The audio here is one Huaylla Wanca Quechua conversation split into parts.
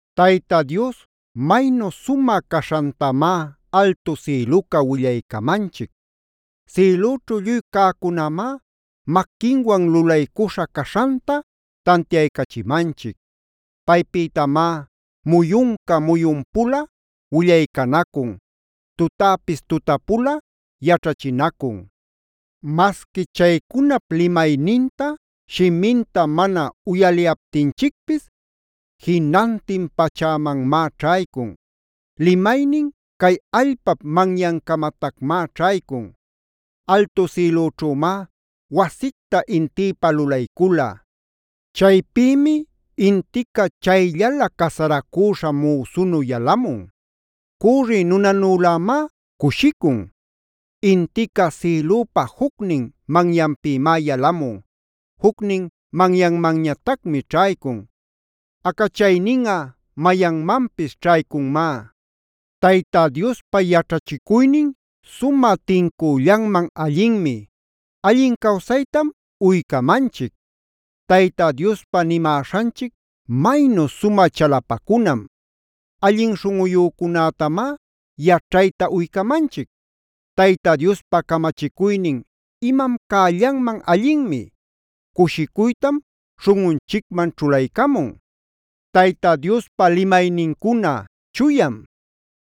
Tayta Dios maynu sumä caśhantamá altu sïluca willaycamanchic. Sïlüćhu lluy cäcunämá maquinwan lulaycuśhä caśhanta tantiaycachimanchic. Paypïtamá muyunca muyun-pula willaycanacun. Tutäpis tuta-pula yaćhachinacun. Masqui chaycunap limayninta, shiminta mana uyaliyaptinchicpis, jinantin pachämanmá ćhaycun. Limaynin cay allpap manyancamatacmá ćhaycun.a Altu sïlüćhümá wasicta intïpa lulaycula. Chaypïmi intica chayllalä casaracüśha müsunu yalamun. Cürri nunanülämá cushicun. Intica sïlüpa jucnin manyanpïmá yalamun. Jucnin manyanmanñatacmi ćhaycun. Acachayninꞌa mayanmanpis ćhaycunmá. Tayta Diospa yaćhachicuynin sumä tincüllanman allinmi: allin cawsaytam uycamanchic. Tayta Diospa nimäśhanchic maynu sumä chalapacunam: allin śhunꞌuyücunätamá yaćhayta uycamanchic. Tayta Diospa camachicuynin imam cällanman allinmi: cushicuytam śhunꞌunchicman ćhulaycamun. Tayta Diospa limaynincuna chuyam: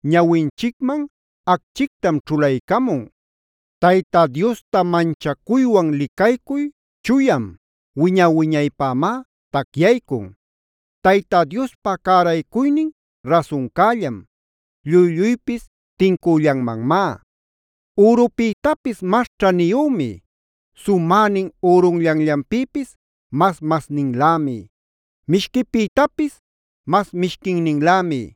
ñawinchicman acchictam ćhulaycamun. Tayta Diosta manchacuywan licaycuy chuyam: wiña-wiñaypämá tacyaycun. Tayta Diospa cäraycuynin rasuncällam: lluy-lluypis tincüllanmanmá. Ürupïtapis mas ćhaniyümi. Sumänin ürunllanllanpïpis mas-masninlämi. Mishquipïtapis mas mishquinninlämi.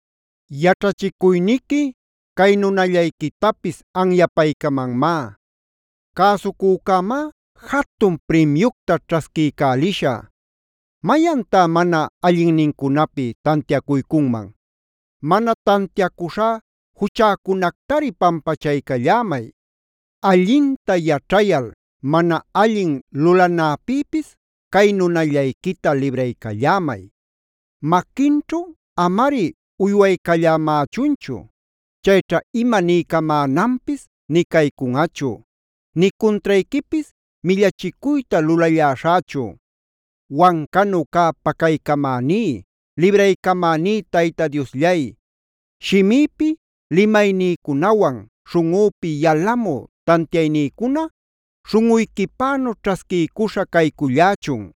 Yaćhachicuyniqui cay nunallayquitapis anyapaycamanmá. Cäsucücämá jatun primyucta ćhasquiycälishä. ¿Mayantá mana allinnincunapi tantiacuycunman? Mana tantiacuśhá juchäcunactari pampachaycallämay. Allinta yaćhayal mana allin lulanäpïpis cay nunallayquita libraycallämay. Maquinćhu amari uywaycallämächunchu. Chayćha ima niycamänanpis nï caycunꞌachu, nï cuntrayquipis millachicuyta lulalläśhächu. Wancanu cä pacaycamäní, libraycamäní Tayta Diosllay, shimïpi limaynïcunawan, śhunꞌüpi yalamü tantiaynïcuna śhunꞌuyquipänu ćhasquiycuśhä caycullächun.